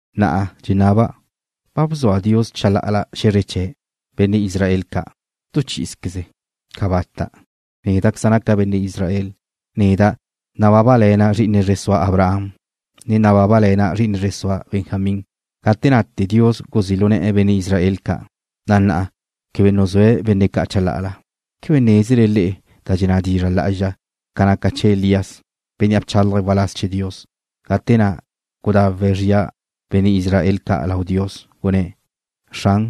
Na'a dxenaba': ¿Ba bzua Dios chalá'ala xe̱zre chee̱', benne' Israel ca', tu chí'izqueze? ¡Cabata'! Néda'queza' naca' benne' Israel. Neda' nabábale̱na' zri'ine zre sua Abraham, ne nabábale̱na' zri'ine zre sua Benjamín. Gate nate Dios guzí' lu ne̱'e̱ benne' Israel ca', na' na'a quebe nuzúe̱' benne' ca' chalá'ala. ¿Quebe nézele le'e da dxenná dizra' lá'azxa ca naca chee̱ Elías, bénnea' bchálaje̱' waláz chee̱ Dios, gate na' gudawe̱' zria benne' Israel ca' lau Dios? Gunné̱': “Xran,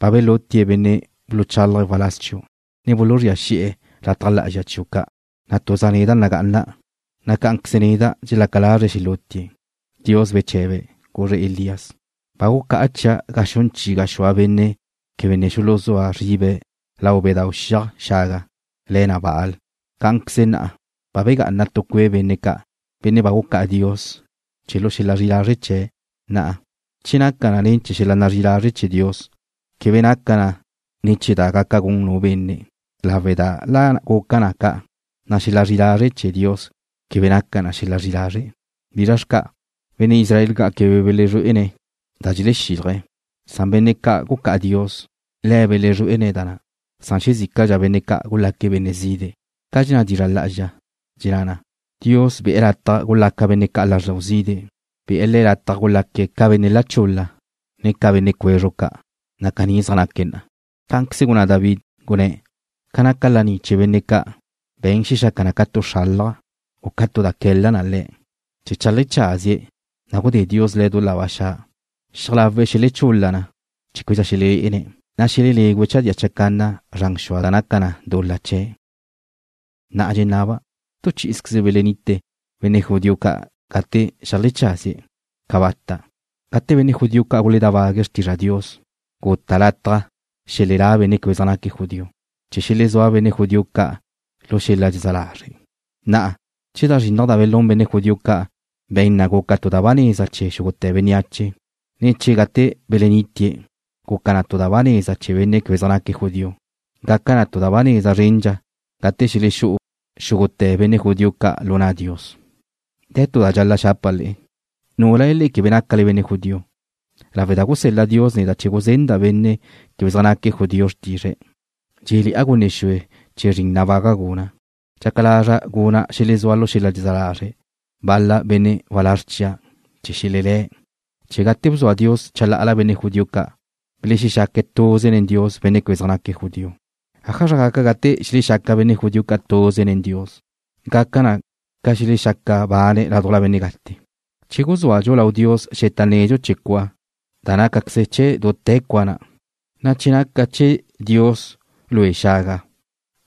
ba belútie̱' benne' buluchálaje̱' waláz chiu', ne buluzría xi'e̱ lataj lá'azxa chiu' ca', na' tuza' neda' nagá'ana', na' cá'anqueze neda' dxelaca lazre̱' xelútie̱'.” Dios beche̱be̱', guzre̱' Elías: “Ba gucá'a chia' ga xun chi gaxúa benne' quebe ne xuluzúa zribe̱' lau bedáu' xiaj xaga le̱ na Baal.” Cá'anqueze na'a ba begá'ana tu cue' benne' ca', benne' ba gucá'a Dios chee̱' lu xel-la zri'i lazre' chee̱'. Na'a, che naca na ne̱ chee̱ xel-la zri'i lazre' chee̱ Dios, quebe naca na ne̱ chee̱ da gaca gun nu benne', lawe' da la guca na ca', na' xel-la zri'i lazre' chee̱ Dios quebe naca na xel-la zri'i lazre'. ¿Bizra xca'? Benne' Israel ca' quebe belezrué'ene̱' da dxelexílaje̱', san benne' ca' gucá'a Dios le̱' belezrué'ene̱' na, san xezícadxa benne' ca' gulaque̱' benne' zide'. Naca ca dxenná dizra' lá'azxa, dxenná na: Dios be̱'e̱ lataj gulaca benne' ca' lázrdau zide'. Be̱'e̱ le̱' lataj gulaque̱' ca benne' la chul-la, ne ca benne' cwezru' ca', na' caní zaj naque̱' na'a. Cá'anqueze gunná Davíd, gunné̱': Ca naca laní chee̱ benne' ca' be̱n xelaca na ca tu xralaj, u ca tu da que̱la na le̱' chee̱ cheajlecházie̱', na' gudé Dios le̱' lu da ba xa'. Xiaj lawe̱' xelechul-la na chee̱ québedxa xelelé'ene̱', na' xelelégüe̱' chadía chacanna zran xua da naca na dul-la chee̱'. Na'a dxenaba': ¿Tu chi'ize belenite benne' judío ca' gate xeajlecházie̱'? ¡Cabata'! Gate benne' judío ca' guledábague̱' xrtizra Dios, guta' lataj xelelá benne' quebe zaj naque̱' judío, chee̱ xelezúa benne' judío ca' lu xel-la dxezá lazre'. Na'a, che da zrinnaj da belún benne' judío ca' be̱n na guca tu da ba neza chee̱ xúgute̱ bénneache, ne che gate belenitie̱' guca na tu da ba neza chee̱ benne' quebe zaj naque̱' judío, gaca na tu da ba neza zrendxa gate xelexú'u xúgute̱ benne' judío ca' lu na' Dios. De̱ tu da dxal-la' xapa' le'e, núlale quebe nácale benne' judío. Lawe' da gusel-la Dios neda' chee̱ guzenda' benne' quebe zaj naque̱' judío xrtizre̱', dxé'le̱'a gunne xue chee̱ zrin nabaga' guna'. Dxaca lazra' guna' xelezúa lu xel-la dxezá lazre' bal-la benne' walázr chia' chee̱ xelelé̱'. Che gate bzua Dios chalá'ala benne' judío ca', belexaca tuze nen Dios benne' quebe zaj naque̱' judío, ¿ájazra gaca gate xelexaca benne' judío ca' tuze nen Dios? Gaca na ca xelexaca bane̱' ládujla benne' gate. Che guzúadxu lau Dios xeta nedxu chee̱ cua, na' nácaqueze chee̱' dute̱ cua na'. Na' che naca chee̱ Dios lue xaga,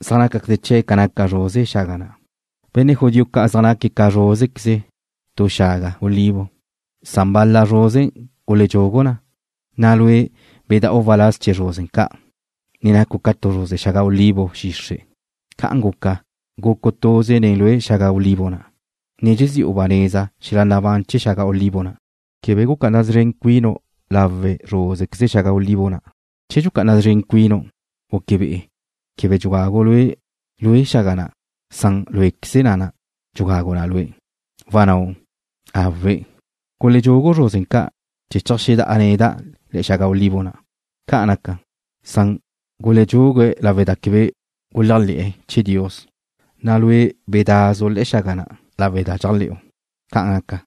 zaj nácaqueze chee̱' ca naca zruze xaga na'. Benne' judío ca' zaj naque̱' ca zrúzequeze tu xaga olivo, san bal-la zruze guledxugu na, na' lue' beda'u waláz chee̱ zruze ca', ne nacu' ca tu zruze xaga olivo xixre'. Ca'an guca, gucu' tuze nen lue xaga olivo chawe' na', ne dxezi'u ba neza xel-la nabán chee̱ xaga olivo na'. Quebe gucá'ana szren cuinu' lawe' zrúzequeze xaga olivo na'. Che dxucá'ana szren cuinu', naca be'e quebe dxugagu' lue' lue xaga na', san luéqueze na' dxugagu na lue'. Wannáu': Awe', guledxugu zruze ca' chee̱ cheajxedá'a neda' le̱'e̱ xaga olivo na'. Ca'an naca, san guledxugu na lawe' da quebe guléajle̱'e̱ chee̱ Dios, na' lue' bedá'azu' le̱'e̱ xaga na' lawe' da dxéajle̱'u. Ca'an naca,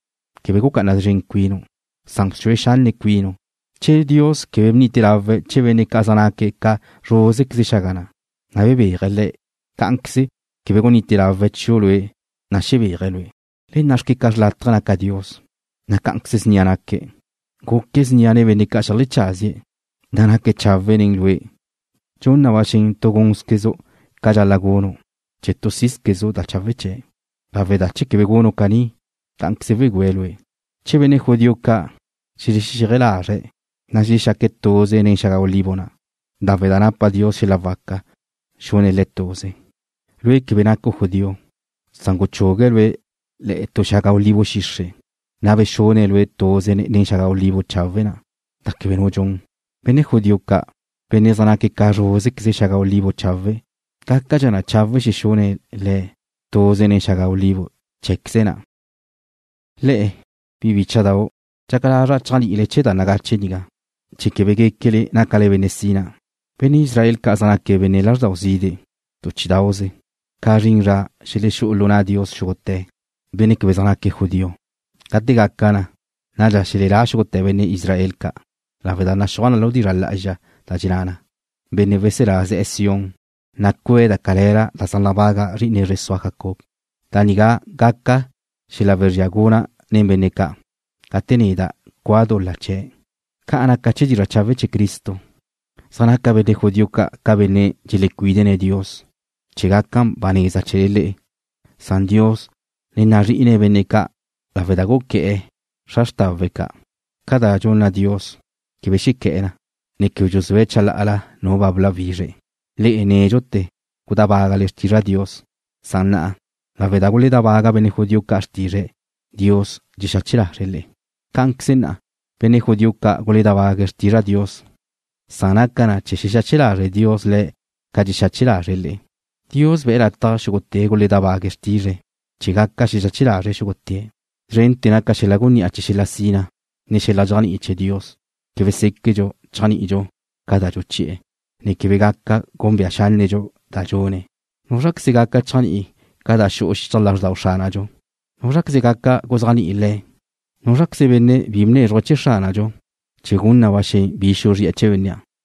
quebe gucá'ana szren cuinu', san bxue xanne' cuinu'. Che Dios quebe bnite lawe̱' chee̱ benne' ca' zaj naque̱' ca zrúzequeze xaga na', na' bebéaje̱' le̱', cá'anqueze quebe gunite lawe̱' chiu' lue', na' xebéaje̱' lue'. Le nna'xque ca xrlátaje naca Dios, na' cá'anqueze ca snia naque̱'. Guque̱' snia nen benne' ca' xeajlecházie̱', na' naque̱' chawe' nen lue'. Dxun na ba xen tu gúnzquezu' ca dxal-la' gunu' chee̱ tu sí'zquezu' da chawe' chee̱', lawe' da che quebe gunu' caní, cá'anqueze wegüe̱' lue'. Che benne' judío ca' xelexexéaj lazre̱', na' xelexaque̱' tuze nen xaga olivo na', lawe' da napa Dios xel-la waca xune̱' le̱' tuze. Lue' quebe nacu' judío, san guchugue̱' lue' le̱'e̱ tu xaga olivo xixre', na' bexune̱' lue' tuze nen xaga olivo chawe' na', da quebe nu dxun. Benne' judío ca', benne' zaj naque̱' ca zrúzequeze xaga olivo chawe' na', gácadxa chawe' xexune̱' le̱' tuze nen xaga olivo cheé̱queze̱' na'. Le'e, bi bícha'dau', dxaca lazra' chéajni'ile chee̱ da nagache nigá, chee̱ quebe guéquele nácale benne' sina. Benne' Israel ca' zaj naque̱' benne' lázrdau zide' tu chí'idauze, ca zrin zra xelexú'u lu na' Dios xúgute̱ benne' quebe zaj naque̱' judío. Gate gaca na, nadxa xelelá xúgute̱ benne' Israel ca' lawe' da naxúaj lu dizra' lá'azxa da dxenná na: Benne' weselá ze̱'e̱ Sión, na' cue̱' da cale̱la da zaj nabaga zri'ine zre sua Jacob. Da nigá gaca xel-la wezría guna' nen benne' ca', gate neda' cua' dul-la chee̱'. Ca naca chee̱ dizra' chawe' chee̱ Cristo, zaj naca benne' judío ca' ca benne' dxelecuídene̱' Dios chee̱ gaca da ba neza chee̱le le'e, san Dios ne nazrí'ine̱' benne' ca' lawe' da guqué̱'e̱ xra xrtawe̱' ca'. Ca da dxunna Dios, quebe xequé̱'e̱ na, ne quebe dxuzúe̱' chalá'ala nu ba bláwizre̱'. Le'e nédxute̱ gudábagale xrtizra Dios, san na'a, lawe' da guledábaga benne' judío ca' xrtizre̱', Dios dxexache lazre̱' le'e. Cá'anqueze na'a, benne' judío ca' dxeledábague̱' xrtizra Dios, san naca na chee̱ xexache lazre' Dios le̱' ca dxexache lazre̱' le'e. Dios be̱' lataj xúgute̱' guledábague̱' xrtizre̱' chee̱ gaca xexache lazre̱' xúgute̱'. Szrente̱ naca xel-la gunní'a chee̱ xel-la sina, ne xel-la dxéajni'i chee̱ Dios. Quebe séquedxu chéajni'idxu ca da dxuchi'e̱, ne quebe gaca gúnbea xánnedxu da dxune̱'. ¿Núzraqueze gaca chéajni'i ca da xu'u xichaj lázrdau Xránadxu? ¿Núzraqueze gaca guzéajni'i Le̱'? ¿Núzraqueze benne' bi bnézruje̱' chee̱ Xránadxu, chee̱ gun na ba xen bi xuzri'e̱ chee̱ bénnea'?